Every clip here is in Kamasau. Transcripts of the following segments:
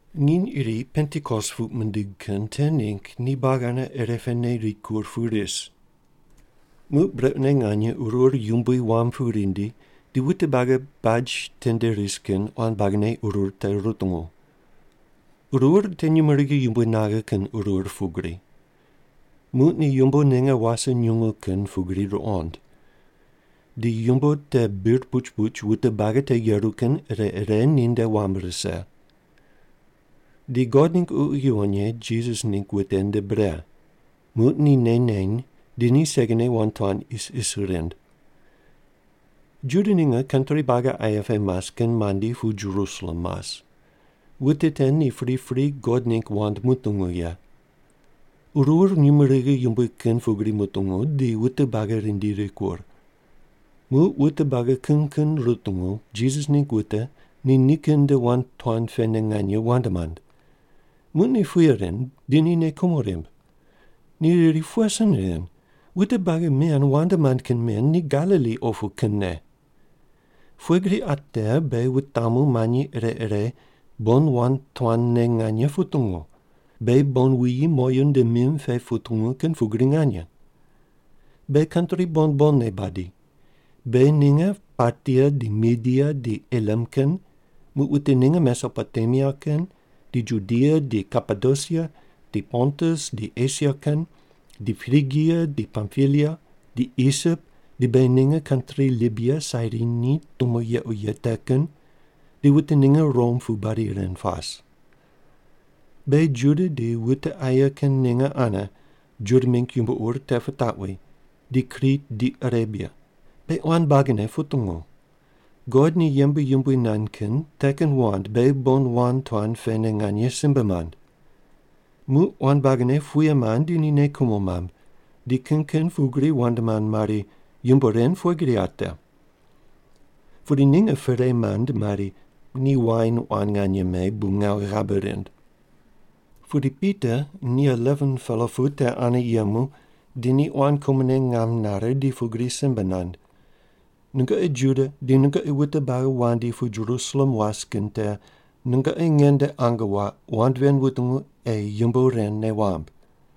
Nginy iri Pentikos puq mindig kin te ningg ni buagi ane irepene rikur pu ris. Muq brequne nganye qurur yumbui wam pu rindi di wute buagi baj tende ris kin quan buagine qurur te rutungu. Qurur te nyumurighi yumbui naghe kin qurur pugri. Muq ni yumbo ninge wase nyungu kin pugri ruqond. Di yumbo te bir puch puch wute buagi te yeru kin ire ire ninde wam rise. Di God ningg Ququ Yuwon Ye Jisas ningg wute nde bre. Muq ni nei neny di ni segine wand tuan isis rind. Juda ninge kantri buagi aye pe mas kin mandi pu Jerusalem mas, wute te ni pripri God ningg wand mutungu ye. Qurur nyumurighi yumbui kin pugri mutungu, di wute buagi rindi rikur. Muq wute buagi kin kin rutungu Jisas ningg wute ni nikin nde wand tuan pene nganye wand mand. Muq ni puye rind, di ni nei kumo rimb. Ni riri, “Pughe sin ren? Wute buagi men wand mand kin men ni Galili opu kinne. Pughe gri qa te beghi wutamu manyi ire ire bon wand tuanne nganye putungu, beghi bon wuyi moyu nde mim pe putungu kin pugri nganye? Beghi kantri bon bonne badi. Beghi ninge Partia di Media di Elam kin, muq wute ninge Mesopotemia kin, di Judia di Kapadosia, di Pontus di Esia kin, di Prigia di Pampilia, di Isip di beghi ninge kantri Libia Sairini tumo yequ ye te kin, di wute ninge Rom pu badi ren pas. Beghi Juda di wute aye kin ninge ane Juda mingg yumbo ur te pitaqwi, di Krit di Arebia, beghi quan buagine putungu. God ni yembe yumbui nand kin te kin wand beghi bon wand tuan pene nganye simbe mand.” Muq quan buagine puye mand di ni nei kumo mamb. Di kin kin pugri wand mand mari, “Yumbo ren pughe gri ate?” Pudi ninge perei mand mari, “Ni wain quan nganye me, bu ngawu ghabe rind.” Pudi Pita ni 11-pela pu te ane yemu di ni quan kumone ngam nare di pugri simbe nand, “Nungoqi Juda di nungoqi wute buagi wandi pu Jerusalem was kin te nungoqi nge nde ange waq, wand ven wutungu ei yumbo ren nei wamb.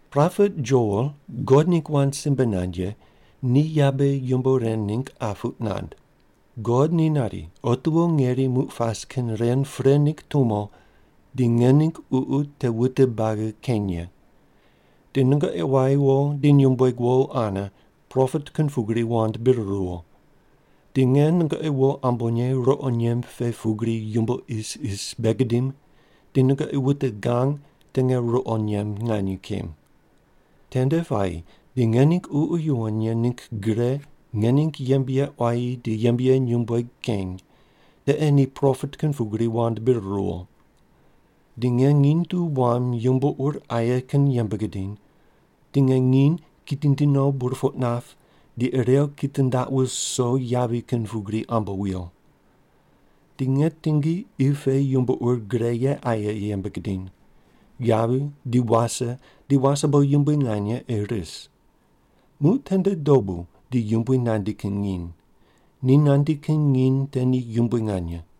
Propet Joel God ningg wand simbe nand ye ni yabe yumbo ren ningg qa puq nand: God ni nari, ‘Otiwo ngeri muq pas kin ren pre ningg tumo di nge ningg Ququ te wute buagi keny ye. Di nungoqi quayi wo di nyumbueg wo ane propet kin pugri wand bir ruwo. Di nge nungoqi wo ambonye ruqo nyemb pe pugri yumbo isis bei gidim, di nungoqi wute gang te nge ruqo nyemb nganye kem. Tende puayi di nge ningg Ququ Yuwon Ye ningg gre nge ningg yembe ye quayi di yembe ye nyumbueg keny, te ei ni propet kin pugri wand bir ruwo. Di nge nginy tu wam yumbo ur aye kin yembe gidiny, di nge nginy kitindi no burpoq nap, di irew kitindaq wuso yavi kin pugri ambo wuyo. Di nge tingi qi pe yumbo ur gre ye aye yembe gidiny. Yavi di wase di wasebo yumbui nganye ei ris. Muq tende dobu di Yumbui nandi kin nginy. Ni nandi kin nginy te di yumbui nganye.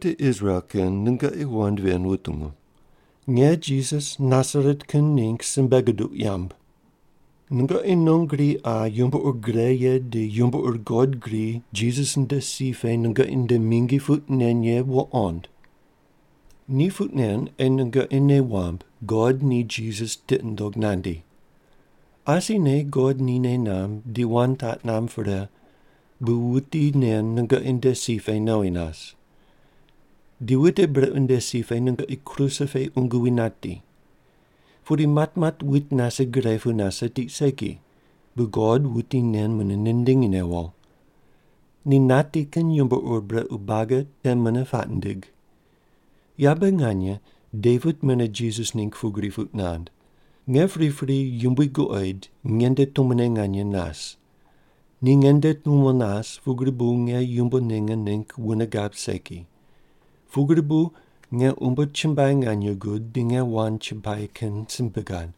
“Wute Israel kin, nungoqi wand ven wutungu. Nge Jisas Nasaret kin ningg simbe guduq yamb. Nungoqi non gri qa yumbo ur gre ye di yumbo ur God gri Jisas nde si pe nungoqi nde mingi puq nen ye wuqond. Ni puq nen ei nungoqi nei wamb God ni Jisas tiqi nundog nandi. Asine God ni nei namb di wand taq namb pre, bu wuti nen nungoqi nde si pe nowi nas. Di wute brequ nde si pe nungoqi kruse pe qungu wi nati. Pudi matmat wuit nase gre pu nase tiq segi, bu God wuti nen mune nindingi newo. Ni nati kin yuqo brequ buagi te mune puaq nindig. Yabe nganye Devit mune Jisas ningg pugri puq nand: Nge pripri Yumbui guqoid nge nde tumone nganye nas. Ni nge nde tumo nas, pugri bu nge yumbo ninge ningg wune gab segi. Pugri bu nge umbo chumbuai nganye gud, di nge wand chumbuai kin simbe gad.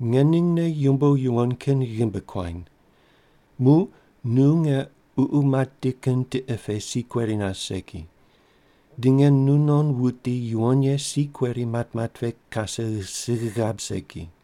Nge ningne yumbo yuwon kin ghimbi kuany. Muq nu nge ququ mati kin tiqe pe si kueri nas segi. Di nge nunon wuti yuwon ye si kueri matmat pe kase sigh gab segi.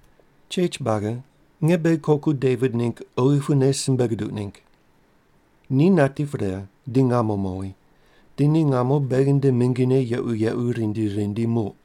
“Chech buagi, nge beghi koku Devit ningg oghi pune simbe guduq ningg. Ni nati pre, di ngamo mowi. Di ni ngamo beghi nde mingine yequ yequ rindi rindi muq.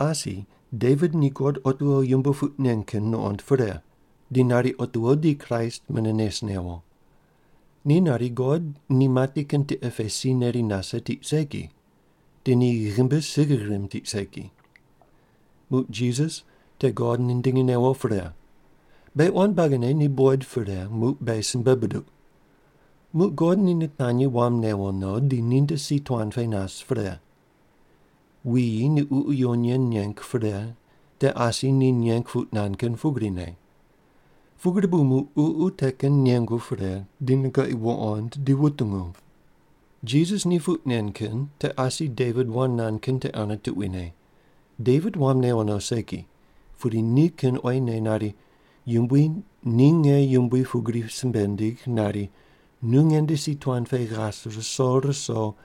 Asi Devit ni God otiwo yumbo puq nen kin nuqond pre, di nari otiwo di Kraist mune nes newo. Ni nari, God ni mati kin tiqe pe si neri nase tiq segi. Di ni ghimbi sigh rimb tiq segi. Muq Jisas te God nindingi newo pre. Beghi quan buagine ni buqoid pre, muq beghi simbe buduq. Muq God ni nitanyi wam newo no, di ninde si tuan pe nas pre. Wuyi ni Ququ Yuwon Ye neng pre, te asi ni neng puq nand kin pugrine. Pugri bu muq Ququ te kin nengu pre, di nungoqi wuqond di wutungu. Jisas ni puq nen kin te asi Devit wand nand kin te ane tuquine. Devit wam newo no segi, pudi ni kin oyine nari, Yumbui ni nge yumbui pugri simbe nindig nari, ‘Nu nge nde si tuan pe ghas ruso ruso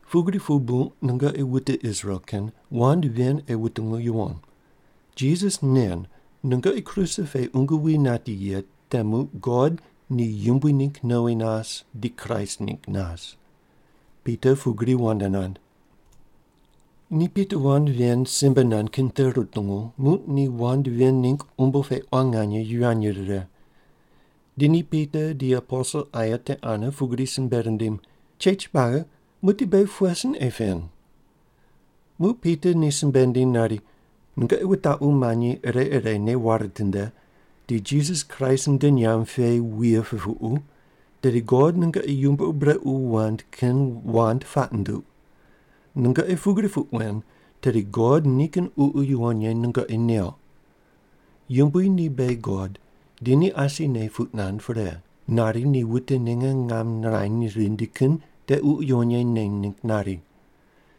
“Pugri pu bu nungoqi wute Israel kin wand ven ei wutungu yuwon. Jisas nen nungoqi kruse pe qungu wi nati ye te muq God ni yumbui ningg nowi nas, di Kraist ningg nas.” Pita pugri wand nand. Ni Pita wand ven simbe nand kin te rutungu, muq ni wand ven ningg umbo pe quan nganye yivany rire. Di ni Pita di aposel aye te ane pugri simbe rindim, “Chech buagi, muqdi beghi pughe sin ei pen?” Muq Pita ni simbe nindiny nari, “Nungoqi wutaqu manyi ire ire nei ware tinde, di Jisas Kraist nde nyamb pe wuye pupuqu, tedi God nungoqi yumbo ur brequ wand kin wand puaq nunduq. Nungoqi pugri puq wen, tedi God nikin Ququ Yuwon Ye nungoqi neuq. Yumbui ni beghi God, di ni asine puq nand pre, nari ni wute ninge ngam nirany rindi kin te Ququ Yuwon Ye neny ningg nari.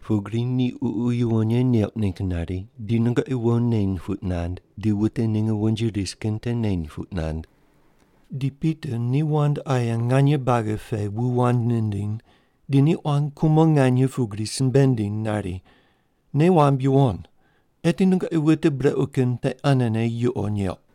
Pugri ni Ququ Yuwon Ye neuq ningg nari, di nungoqi wo neny puq nand, di wute ninge wonji ris kin te neny puq nand.” Di Pita ni wand aye nganye buagi pe wu wand nindiny, di ni quan kumo nganye pugri simbe nindiny nari, “Nei wamb yuwon: Eti nungoqi wute brequ kin te anene yuqo neuq.”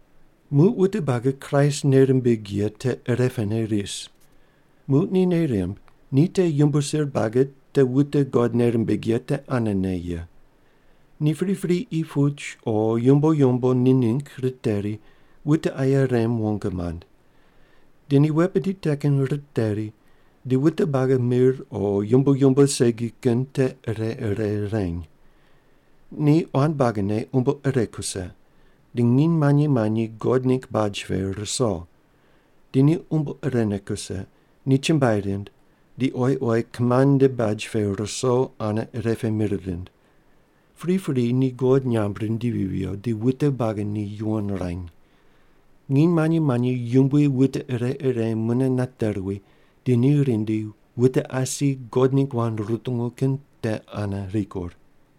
Muq wute buagi Kraist nei rimbig ye te ire pene ris. Muq ni nei rimb ni te yumbo sir buagi te wute God nei rimbig ye te anene ye. Ni pripri qi puch o yumbo yumbo ni ningg riteri, wute aye rem wong mand. Di ni wet bidi te kin riteri, di wute buagi mir o yumbo yumbo segi kin te ire ire reny. Ni quan buagine umbo ire kuse, di nginy manyi manyi God ningg baj pe ruso. Di ni umbo irene kuse, ni chumbuai rind, di oyi oyi kimand nde baj pe ruso ane ire pe mir rind. Pripri ni God nyamb rindivi viyo, di wute buagi ni yuwon ruany. Nginy manyi manyi Yumbui wute ire ire mune nate ruwi, di ni rindi wute asi God ningg wand rutungu kin te ane rikur.